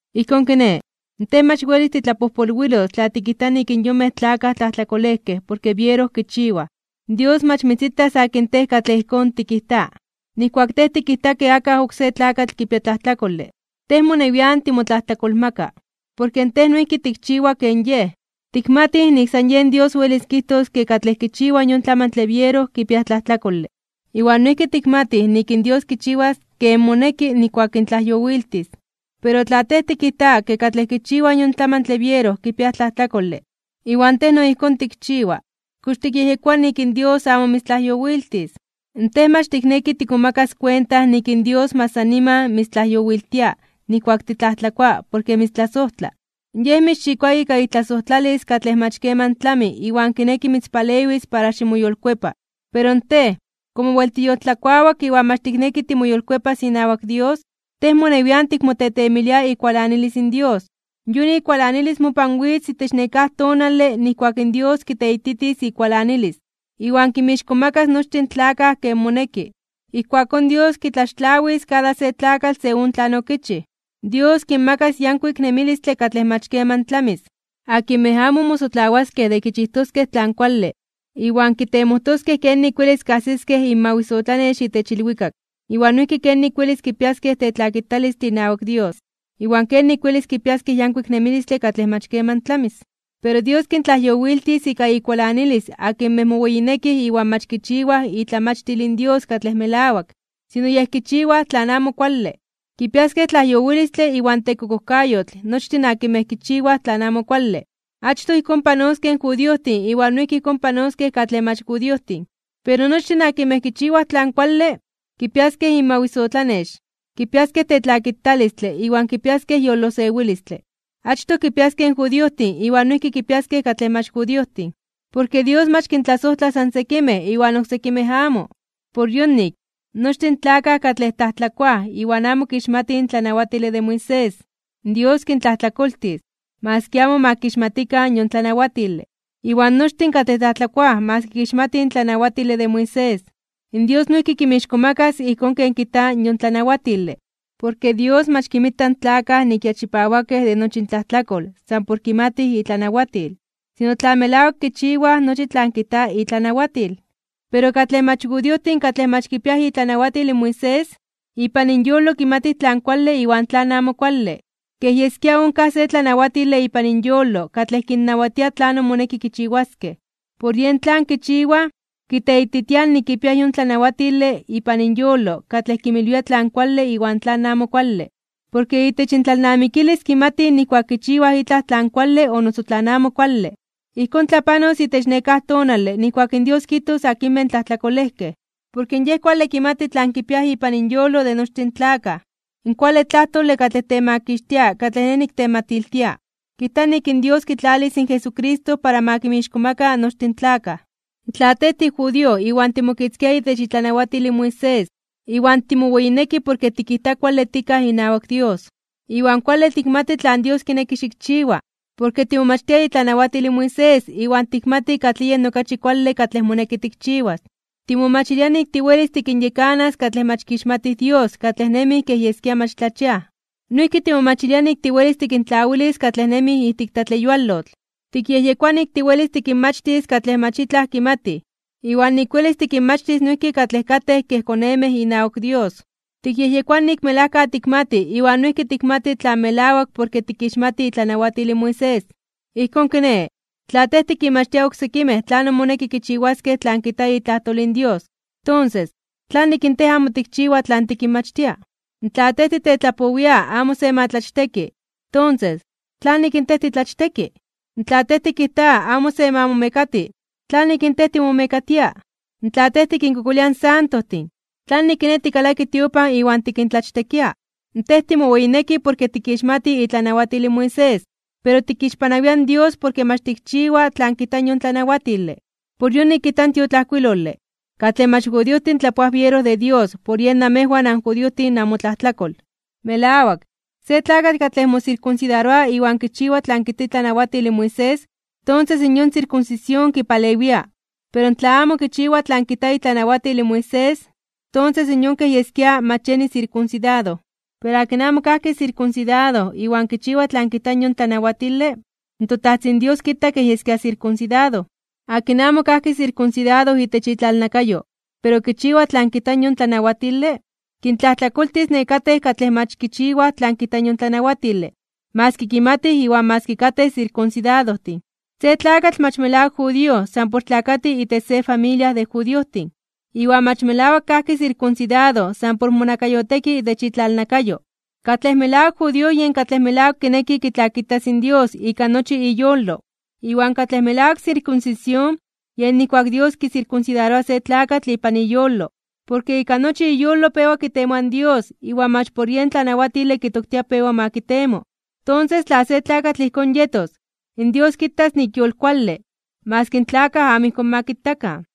Ijkón kiné, tej mach welis titlapojpolwilos tla tikijta nik in yonmej tlakaj tlajtlakolejkej porke biero kichiwaj. Dios mach mitzitas akin tej katlej ijkón tikijta. Nijkuak tej tikijta ke akaj oksé tlakatl kipia tlajtlakole, tej monewian timotlajtlakolmaka, porke tej noijki tikchiwa ken yej. Tikmatij nik san yen Dios welis kijtos ke katlej kichiwaj yon tlamantle biero kipiaj tlajtlakole. Iwan noijki tikmatij nik in Dios kichiwas ken moneki nijkuak kintlajyowiltis. Pero tla tej tikijta kej katlej kichiwaj yon tlamantle biero kipiaj tlajtlakole, iwan tej no ijkón tikchiwa, ¿kox tikyejyekoa nik in Dios amo mitztlajyowiltis? Tej mach tikneki tikmomakas kuenta nik in Dios mach san niman mitztlajyowiltia nijkuak titlajtlakoa porke mitztlasojtla. Yej mitzxikoa ika itlasojtlalis katlej mach keman tlami iwan kineki mitzpalewis para ximoyolkuepa. Pero tej, komo wel tiyoltlakuawak iwan mach tikneki timoyolkuepas inawak Dios, tej monewian tikmotetemilia ikualanilis in Dios. Yon ikualanilis mopan witz itech nekáj tonale nijkuak in Dios kiteititis ikualanilis, iwan kinmixkomakas (kintzonmanas) nochtin in tlakaj ken moneki. Ijkuakón Dios kitlaxtlawis kada se tlakatl según tlan okichij. Dios kinmakas yankuik nemilistle katlej mach keman tlamis, akinmej amo mosotlawaskej de kichijtoskej tlan kuale iwan kitemojtoskej kenik welis kajsiskej inmawisotlanex itech ilwikak, iwan noijki kenik welis kipiaskej tetlakitalistle inawak Dios, iwan kenik welis kipiaskej yankuik nemilistle katlej mach keman tlamis. Pero Dios kintlajyowiltis ika ikualanilis akinmej moweyinekij iwan mach kichiwaj itlamachtil in Dios katlej melawak, sino yej kichiwaj tlan amo kuale. Kipiaskej tlajyowilistle iwan tekokojkayotl nochtin akinmej kichiwaj tlan amo kuale. Achtoj ijkón panoskej in judiojtin iwan noijki ijkón panoskej katlej mach judiojtin. Pero nochtin akinmej kichiwaj tlan kuale, kipiaskej inmawisotlanex, kipiaskej tetlakitalistle iwan kipiaskej yolosewilistle. Achtoj kipiaskej in judiojtin iwan noijki kipiaskej katlej mach judiojtin. Porke Dios mach kintlasojtla san sekimej iwan oksekimej amo. Por yonik, nochtin in tlakaj katlej tlajtlakoaj iwan amo kixmatij in tlanawatile de Moisés, in Dios kintlajtlakoltis, maski amo ma kixmatikan yon tlanawatile. Iwan nochtin katlej tlajtlakoaj maski kixmatij in tlanawatile de Moisés, in Dios noijki kinmixkomakas (kintzonmanas) ijkón ken kijta yon tlanawatile. Porke Dios mach kinmita in tlakaj nik ya chipawakej de nochi intlajtlakol san kimatij itlanawatil, sino tla melawak kichiwaj nochi tlan kijta itlanawatil. Pero katlej mach judiojtin katlej mach kipiaj itlanawatil in Moisés, ipan inyolo kimatij tlan kuale iwan tlan amo kuale, kej yeskia onkaj se tlanawatile ipan inyolo katlej kinnawatia tlanon moneki kichiwaskej. Por yen tlan kichiwaj, kiteititiaj nik kipiaj yon tlanawatile ipan inyolo katlej kinmilwia tlan kuale iwan tlan amo kuale. Porke itech intlalnamikilis kimatij nijkuak kichiwaj itlaj tlan kuale o noso tlan amo kuale. Ijkón tlapanos itech nekáj tonale nijkuak in Dios kijtos akinmej tlajtlakolejkej, porke Yej kuale kimati tlan kipiaj ipan inyolo de nochtin in tlakaj. In kuale tlajtole katlej temakixtia katlej nej niktematiltia, kijta nik in Dios kitlalis in Jesucristo para ma kinmixkomaka nochtin in tlakaj. Tla tej tijudío iwan timokitzkia itech itlanawatil in Moisés, iwan timoweyineki porke tikijta kuale tikaj inawak Dios. Iwan kuale tikmati tlan Dios kineki xikchiwa, porke timomachtia itlanawatil in Moisés iwan tikmati katlij yen okachi kuale katlej moneki tikchiwas. Timomachilia nik tiwelis tikinyekanas katlej mach kixmatij Dios katlej nemij kej yeskia mach tlachiaj. Noijki timomachilia nik tiwelis tikintlawilis katlej nemij ijtik tlatleyualotl. Tikyejyekoa nik tiwelis tikinmachtis katlej mach itlaj kimatij, iwan nik welis tikinmachtis noijki katlej katej kej konemej inawak Dios. Tikyejyekoa nik melajka tikmati iwan noijki tikmati tlan melawak porke tikixmati itlanawatil in Moisés. Ijkón kiné, tla tej tikinmachtia oksekimej tlanon moneki kichiwaskej tlan kijta itlajtol in Dios, tonses ¿tlanik in tej amo tikchiwa tlan tikinmachtia? Tla tej titetlapowia amo se ma tlachteki, tonses, ¿tlanik in tej titlachteki? Tla tej tikijta amo se ma momekati, ¿tlanik in tej timomekatia? Tla tej tikinkokolia in santojtin, ¿tlanik kiné tikalaki tiopan iwan tikintlachtekia? Tej timoweyineki porke tikixmati itlanawatil in Moisés, pero tikixpanawia in Dios porke mach tikchiwa tlan kijta yon tlanawatile. Por yonik kijta in tiotlajkuilole: “Katlej mach judiojtin tlapoaj biero de Dios por yen namejwan anjudiojtin namotlajtlakol.” Melawak, se tlakatl katlej mosirkunsidaroa iwan kichiwa tlan kijta itlanawatil in Moisés, tonses yon sirkunsisión kipalewia. Pero tla amo kichiwa tlan kijta itlanawatil in Moisés, tonses yon kej yeskia mach yeni sirkunsidado. Pero akin amo kajki sirkunsidado iwan kichiwa tlan kijta yon tlanawatile, in toTajtzin Dios kita kej yeskia sirkunsidado. Akin amo kajki sirkunsidado itech itlalnakayo, pero kichiwa tlan kijta yon tlanawatile, kintlajtlakoltis nekatej katlej mach kichiwaj tlan kijta yon tlanawatile maski kimatij iwan maski katej sirkunsidadojtin. Se tlakatl mach melawak judío san por tlakati itech se familia de judiojtin, iwan mach melawak kajki sirkunsidado san por monakayoteki itech itlalnakayo. Katlej melawak judío yen katlej melawak kineki kitlakitas in Dios ika nochi iyolo. Iwan katlej melawak sirkunsisión yen nijkuak in Dios kisirkunsidaroa se tlakatl ipan iyolo, porke ika nochi iyolo pewa kitemoa in Dios iwan mach por yen tlanawatile kitoktia pewa ma kitemo. Tonses, tla se tlakatl ijkón yetos, in Dios kitas nik yolkuale, maski in tlakaj amo ijkón ma kitakan.